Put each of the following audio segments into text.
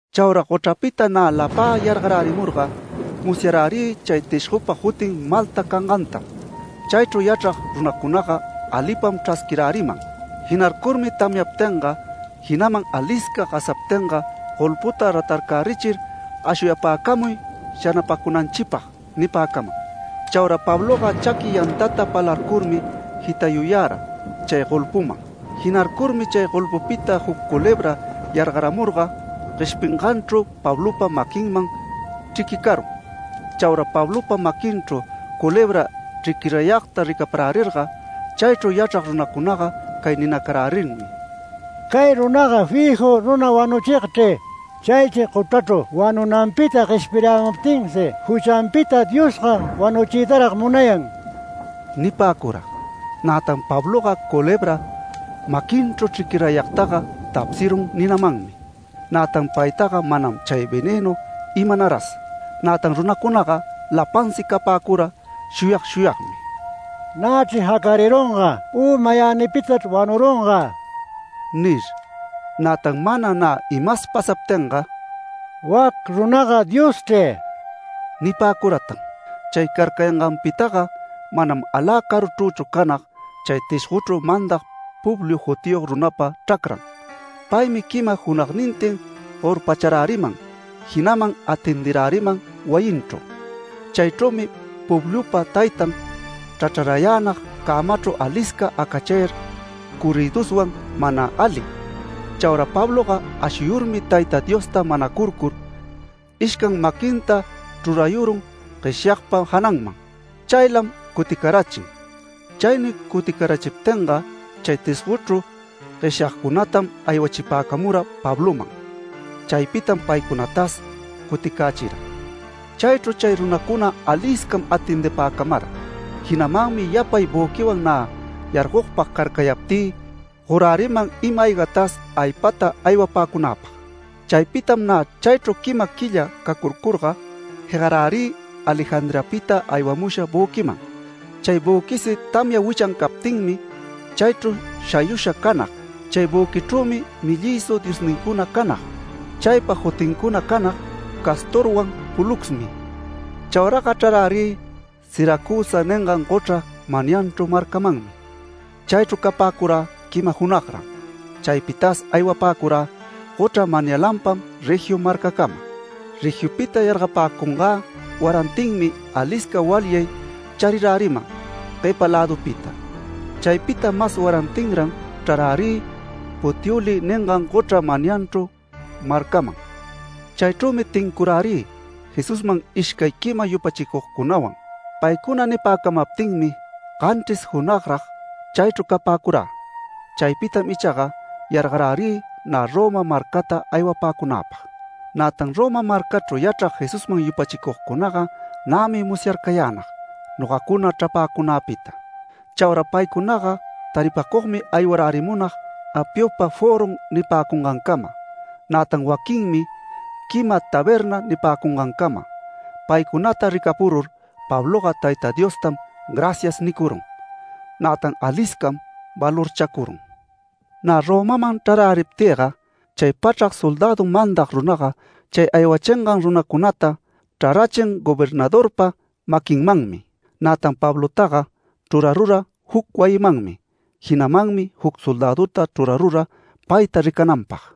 Chaura gochrapita nä lapä yargarärimurga musyarärï chay tishgopa jutin Malta cangantam. Chaychru yachrag runacunaga alipam chrasquiräriman. Jinarcurmi tamyaptinga, jinaman alisca gasaptinga golputa ratarcärichir “Ashuyapäcamuy shanapacunanchipag” nipäcaman. Chaura Pabloga chaqui yantata palarcurmi jitayuyara chay golpuman. Jinarcurmi chay golpupita juc culebra yargaramurga gueshpinganchru Pablopa maquinman chriquicarun. Chaura Pablopa maquinchru culebra chriquirayagta ricaparärirga chaychru yachrag runacunaga cay ninacarärinmi: “Cay runaga fiju runa wanuchigchri. Chaychri gochrachru wanunanpita gueshpirayämuptinsi juchanpita Diosga wanuchiytarag munayan” nipäcura. Nätan Pabloga culebra maquinchru chriquirayagtaga tapsirun ninamanmi. Nätan paytaga manam chay venënu imanaras. Nätan runacunaga lapansi capäcura shuyag shuyagmi: “Nächri jacarirunga u mayänipitachri wanurunga” nir. Nätan mana nä imas pasaptinga “Wac runaga dioschri” nipäcuratan. Chay carcayangäpitaga manam alä caruchrüchu canag chay tishgochru mandag Publio jutiyog runapa chracran. Paymi quima junagnintin gorpacharäriman, jinaman atendiräriman wayinchru. Chaychrümi Publiopa taytan chrachrarayänag cämachru alisca acachayar corrïduswan mana ali. Chaura Pabloga ashuyurmi Tayta Diosta manacurcur, ishcan maquinta chrurayurun gueshyagpa jananman. Chaylam cuticarachin. Chaynuy cuticarachiptinga chay tishgochru gueshyagcunatam aywachipäcamura Pabloman. Chaypitam paycunatas cuticächira. Chaychru chay runacuna aliscam atendipäcamara, jinamanmi yapay büquiwan nä yargogpag carcayaptï goräriman ima-aygatas aypata aywapäcunäpag. Chaypitam nä chaychru quima quilla cacurcurga, jegarärï Alejandriapita aywamusha büquiman. Chay büquisi tamya wichan captinmi chaychru shayusha canag. Chay büquichrümi ‘Mellïshu’ diosnincuna canag. Chaypa jutincuna canag ‘Castorwan Poluxmi’. Chauraga chrarärï Siracusa ningan gochra manyanchru marcamanmi. Chaychru capäcurä quima junagran. Chaypitas aywapäcurä gochra manyalanpam Regio marcacama. Regiopita yargapäcungä warantinmi alisca walyay chariräriman guepa lädupita. Chaypita mas warantinran chrarärï Puteoli ningan gochra manyanchru marcaman. Chaychrümi tincurärï Jesusman ishcay quima yupachicugcunawan. Paycuna nipäcamaptinmi ganchris junagrag chaychru capäcurä. Chaypitam ichaga yargarärï nä Roma marcata aywapäcunäpag. Nätan Roma marcachru yachrag Jesusman yupachicugcunaga nämi musyarcayänag nogacuna chrapäcunäpita. Chaura paycunaga taripacugmi aywarärimunag Apiopa Foron nipäcungancama, nätan waquinmi Quima Taberna nipäcungancama. Paycunata ricapurur Pabloga Tayta Diostam “Gracias” nicurun, nätan aliscam valorchacurun. Nä Romaman chraräriptïga chay pachrac soldädu mandag runaga chay aywachingan runacunata chrarachin gobernadorpa maquinmanmi. Nätan Pablotaga chrurarura juc wayimanmi. Jinamanmi juc soldäduta chrurarura payta ricananpag.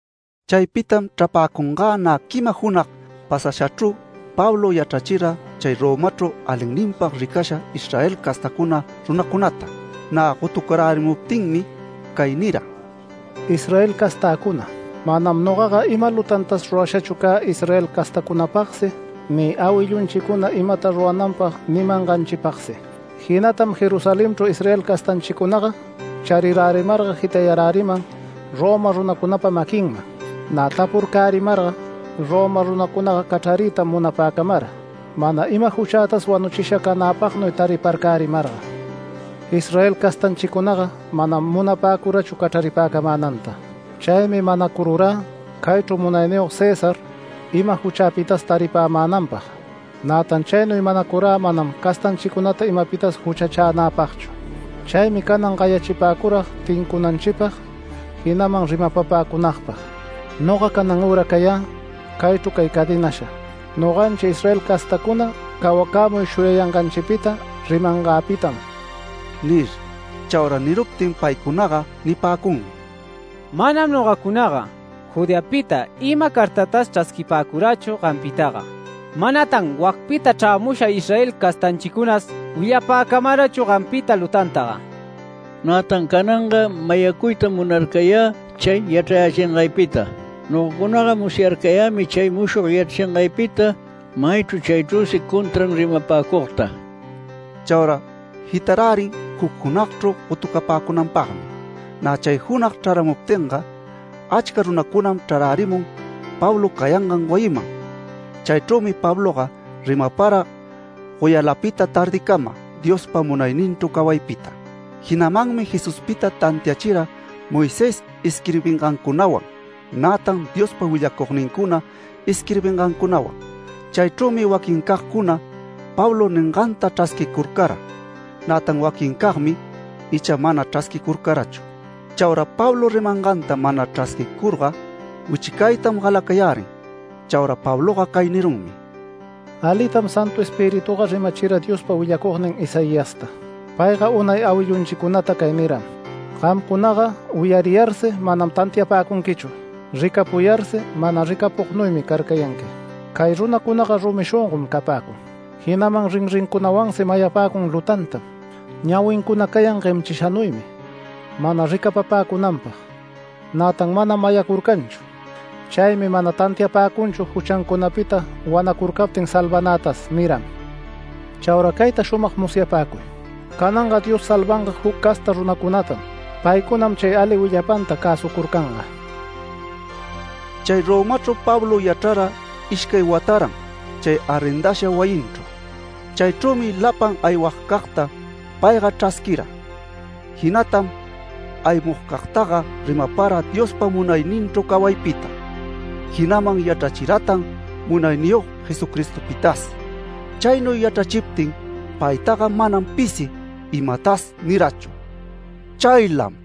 Chaypitam chrapäcungä nä quima junag pasashachru, Pablo gayachira chay Romachru alinninpag ricasha Israel castacuna runacunata. Nä gotucarärimuptinmi cay nira: “Israel castäcuna, manam nogaga ima lutantas rurashachu cä Israel castacunapagsi ni awillunchicuna imata rurananpag nimanganchipagsi. Jinatam Jerusalenchru Israel castanchicunaga charirärimarga jitayaräriman Roma runacunapa maquinman. Nä tapurcärimarga Roma runacunaga cachrariytam munapäcamara mana ima juchätas wanuchisha canäpagnuy tariparcärimarga. Israel castanchicunaga manam munapäcurachu cachraripäcamänanta. Chaymi manacururä caychru Munayniyog César ima juchäpitas taripämänanpag. Nätan chaynuy manacurä manam castanchicunata imapitas juchachänäpagchu. Chaymi canan gayachipäcurag tincunanchipag, jinaman rimapapäcunagpag. Noga canan üra cayä caychru cay cadenasha, noganchi Israel castacuna cawacämuy shuyayanganchipita rimangäpitam” nir. Chaura niruptin paycunaga nipäcunmi: “Manam nogacunaga Judeapita ima cartatas chrasquipäcurächu gampitaga. Manatan wacpita chrämusha Israel castanchicunas willapäcamarachu gampita lutantaga. Nätan cananga mayacuytam munarcayä chay yachrayächingaypita. Nogacunaga musyarcayämi chay mushog yachrachingaypita maychru chaychrüsi contran rimapäcugta”. Chaura jitarärin juc junagchru gotucapäcunanpagmi. Nä chay junag chraramuptinga, achca runacunam chrarärimun Pablo cayangan wayiman. Chaychrümi Pabloga rimapara goyalapita tardicama Diospa munayninchru cawaypita. Jinamanmi Jesuspita tantiachira Moisés isquirbingancunawan, nätan Diospa willacugnincuna isquirbingancunawan. Chaychrümi waquincagcuna Pablo ninganta chrasquicurcara. Nätan waquincagmi icha mana chrasquicurcarachu. Chaura Pablo rimanganta mana chrasquicurga wichicaytam galacayärin. Chaura Pabloga cay nirunmi: “Alitam Santu Espirituga rimachira Diospa willacugnin Isaiasta. Payga unay awillunchicunata cay niram: ‘Gamcunaga wiyariyarsi manam tantiapäcunquichu. Ricapuyarsi mana ricapugnuymi carcayanqui. Cay runacunaga rumi shongon capäcun. Jinaman rinrincunawansi mayapäcun lutantam. Ñawincuna cayan guemchishanuymi mana ricapapäcunanpag, nätan manam mayacurcanchu. Chaymi mana tantiapäcunchu juchancunapita wanacurcaptin salvanätas’ niram. Chaura cayta shumag musyapäcuy: Cananga Dios salvanga juc casta runacunatam. Paycunatam chay ali willapanta cäsucurcanga”. Chay Romachru Pablo yachrara ishcay wataran chay arrendasha wayinchru. Chaychrümi lapan aywagcagta payga chrasquira. Jinatam aymugcagtaga rimapara Diospa munayninchru cawaypita, jinaman yachrachiratan Munayniyog Jesucristopitas. Chaynuy yachrachiptin paytaga manam pisi imatas nirachu. Chaylam.